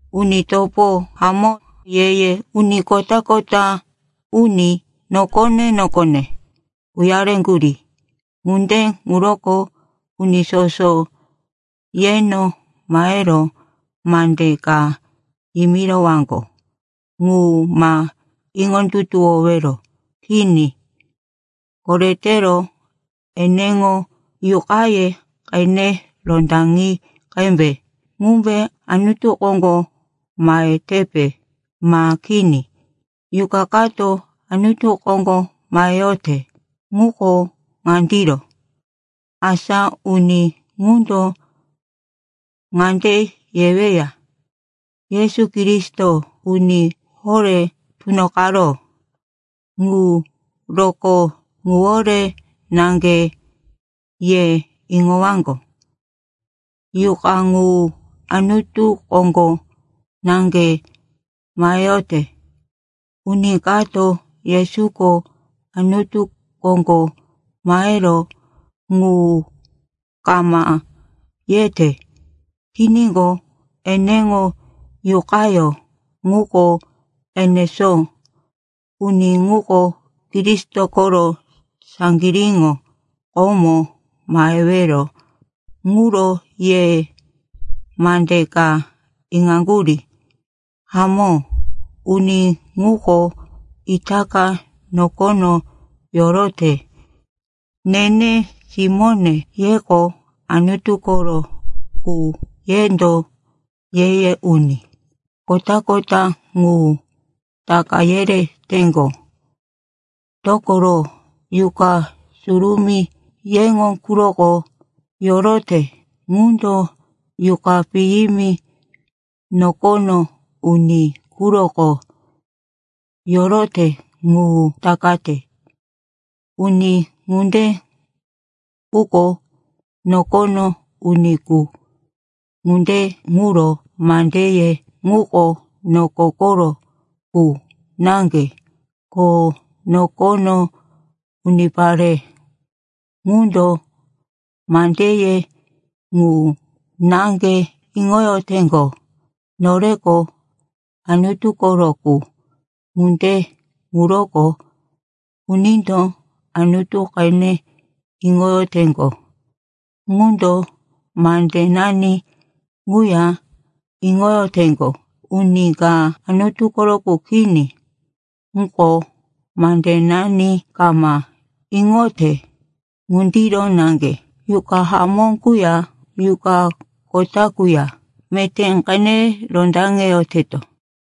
Uni topo hamó, ye-ye uni kota-kota uni nokone-nokone uyareŋgurí. Ŋunde ŋuroko uni soso yeno mahero mande ka yimirowaŋgo ŋu ma iŋondutuwowero. Kini, koretero eneŋo yuqaye qene rondaŋi qembe, ŋumbe Anutu koŋgo mahetepe ma kini. Yuqa kato Anutu koŋgo maheyote ŋuko ŋandiro. Asa uni ŋundo ŋande yeweya, “Yesu Kristo uni horé tunoqaró.” Ŋu rokó ŋuwore naŋge ye iŋowaŋgo, yuqa ŋu Anutu koŋgo naŋge maheyote. Uni kato Yesuko Anutu koŋgo maheró ŋu kama yete tiníqo, eneŋo yuqayó ŋuko enesó. Uni ŋuko Kristo koro saŋgiríŋo, komo mahewero ŋuro ye mande ka iŋaŋgurí. Hamó, uni ŋuko itaka nokono yorote. Nene simóne, yeko Anutu koro qu, yendo ye-ye uni kota-kota ŋu taka yereteŋgo, dokoro, yuqa surumí yeŋo quroko yorote ŋundo yuqa piyimi nokono uni quroko yorote ŋu takate. Uni ŋunde quko nokono uni qu. Ŋunde ŋuro mandeye ŋuko noko koro qu naŋge, ko nokono unipare ŋundo mandeye ŋu naŋge iŋoyoteŋgo. Noreko Anutu koro qu, ŋunde ŋuroko unindo Anutu qene iŋoyoteŋgo ŋundo mandenani ŋuya iŋoyoteŋgo. Uni ka Anutu koro qu kini muko, mandenani kama iŋote. Ŋundiro naŋge yuqa hamó quya yuqa kota quya meté qene rondaŋeyoteto.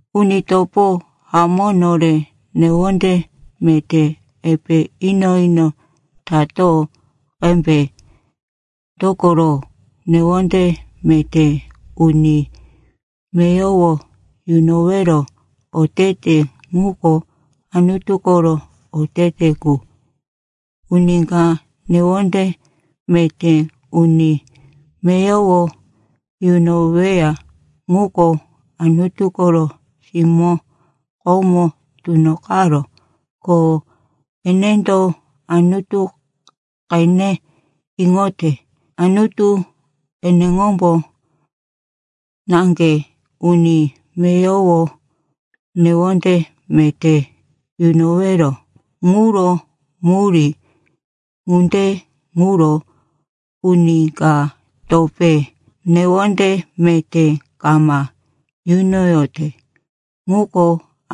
Uni topo hamó, nore newonde meté epe ino-ino tato qembe, dokoro newonde meté uni meyowo yunowero otete ŋuko Anutu koro otete qu. Uni ka newonde meté uni meyowo yunoweya ŋuko Anutu koro simó komo tunoqaró, ko enendo Anutu qene iŋote. Anutu eneŋombo naŋge uni meyowo newonde meté yunowero ŋuro murí. Ŋunde ŋuro uni ka topé newonde meté kama yunoyote ŋuko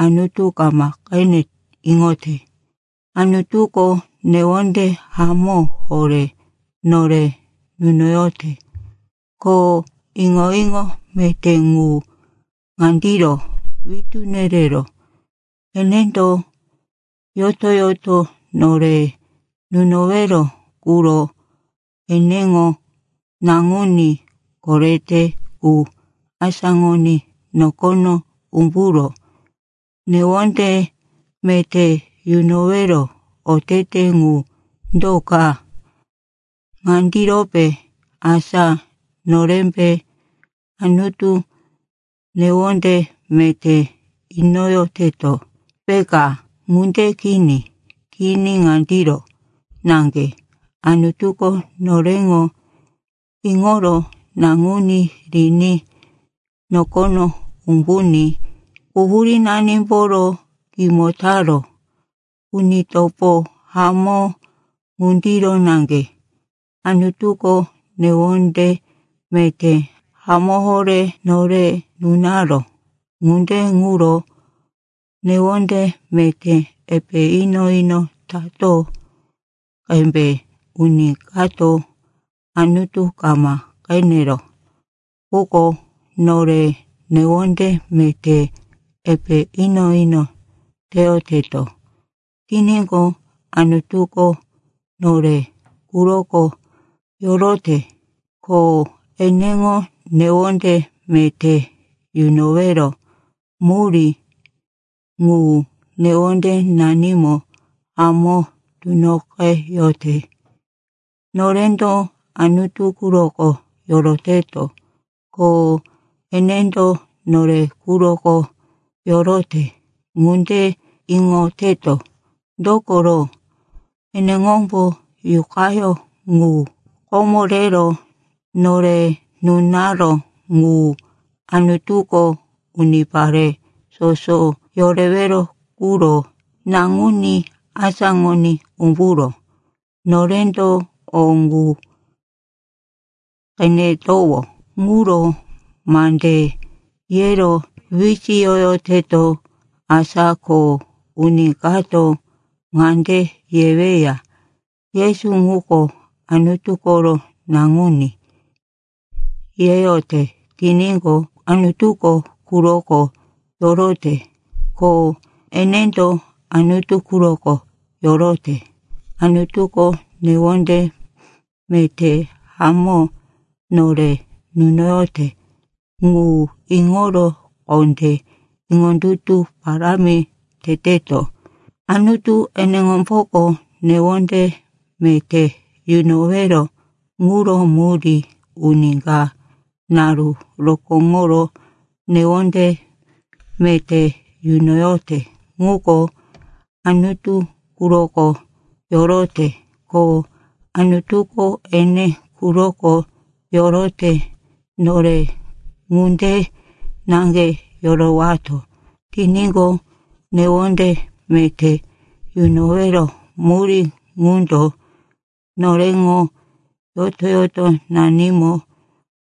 Anutu kama qene iŋote. Anutuko newonde hamó horé nore nunoyote, ko iŋo-iŋo meté ŋu ŋandiro witú nereró: enendo yoto-yoto nore nunowero quro eneŋo Naŋuní korete qu asáŋoní nokono umburó. Newonde meté yunowero otete ŋu do ka? Ŋandirope, asa norembe Anutu newonde meté inoyoteto, peka? Ŋunde kini. Kini, ŋandiro naŋge, Anutuko noreŋo iŋoro Naŋuní riní nokono umbuní quhurínanimboro kimo taró. Uni topo hamó, ŋundiro naŋge Anutuko newonde meté hamó horé nore nunaró. Ŋunde ŋuro newonde meté epe ino-ino tato qembe. Uni kato Anutu kama qeneró. Quko nore newonde meté epe ino-ino teyoteto tiníqo, Anutuko nore quroko yorote, ko eneŋo newonde meté yunowero murí ŋu newondenanimo hamó tunoqeyote. Norendo Anutu quroko yoroteto, ko enendo nore quroko yorote. Ŋunde iŋoteto, dokoro eneŋombo Yuqayó ŋu komo rero nore nunaró ŋu. Anutuko unipare soso yorewero quro Naŋuní asáŋoní umburó. Norendo o ŋu qenetowó ŋuro mande yero wisiyoyoteto. Asa ko uni kato ŋande yeweya, “Yesu ŋuko Anutu koro Naŋuní,” yeyote tiníqo, Anutuko quroko yorote, ko enendo Anutu quroko yorote. Anutuko newonde meté hamó nore nunoyote ŋu iŋoro kondé iŋondutu parámi teteto. Anutu eneŋomboko newonde meté yunowero ŋuro murí. Uni ka naru rokóŋoro newonde meté yunoyote ŋuko Anutu quroko yorote, ko Anutuko ene quroko yorote. Nore ŋunde naŋge yorowato tiníqo, newonde meté yunowero murí ŋundo noreŋo yoto-yotonanimo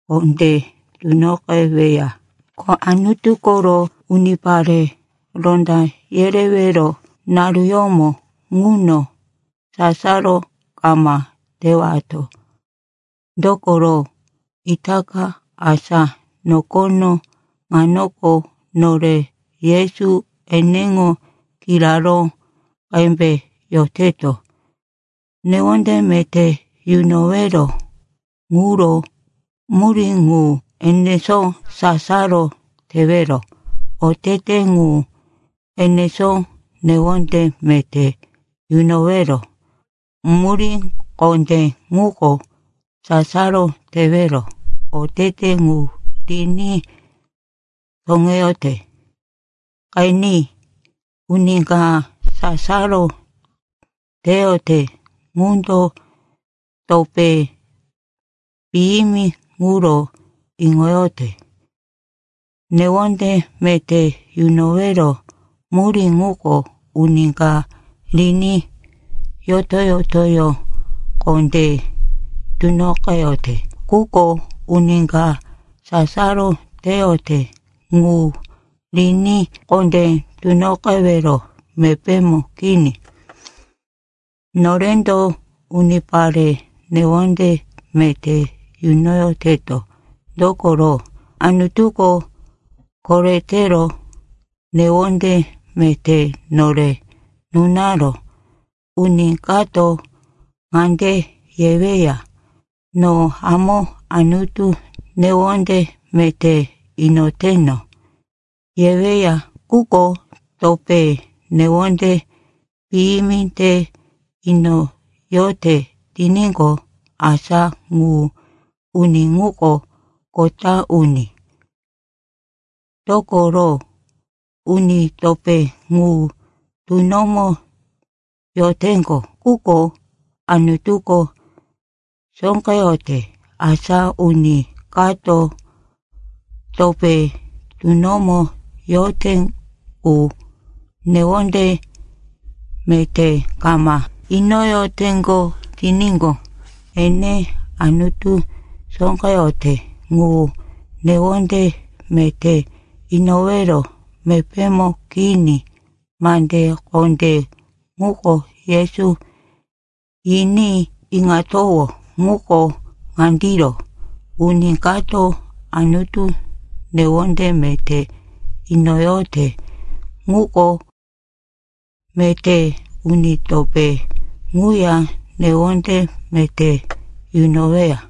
kondé tunoqeweya. Ko Anutu koro unipare ronda yerewero naruyómo ŋuno sasaro kama tewato. Dokoro itaka, asa nokono ŋanoko, nore Yesu eneŋo kiraró qembe yoteto. Newonde meté yunowero ŋuro murí ŋu enesó, sasaro tewero otete ŋu enesó. Newonde meté yunowero murí kondé ŋuko sasaro tewero otete ŋu riní toŋeyote. Qeni, uni ka sasaro teyote ŋundo topé piyimi ŋuro iŋoyote. Newonde meté yunowero murí ŋuko uni ka riní yoto-yotoyó kondé tunoqeyote, quko uni ka sasaro teyote ŋu riní kondé tunoqewero mepémo kini. Norendo unipare newonde meté yunoyoteto, dokoro Anutuko koretero newonde meté nore nunaró. Uni kato ŋande yeweya, “No hamó Anutu newonde meté inoteno,” yeweya, quko topé newonde piyimi te inoyote tiníqo, asa ŋu uni ŋuko kota uni. Dokoro uni topé ŋu tunomo yoteŋgo, quko Anutuko sóqeyote. Asa uni kato topé tunomo yote qu newonde meté kama inoyoteŋgo tiníqo, ene Anutu sóqeyote ŋu newonde meté inowero mepémo kini. Mande kondé ŋuko Yesuko yiní iŋatowó ŋuko ŋandiro, uni kato Anutu newonde meté inoyote ŋuko meté uni topé ŋuya newonde meté yunoweya.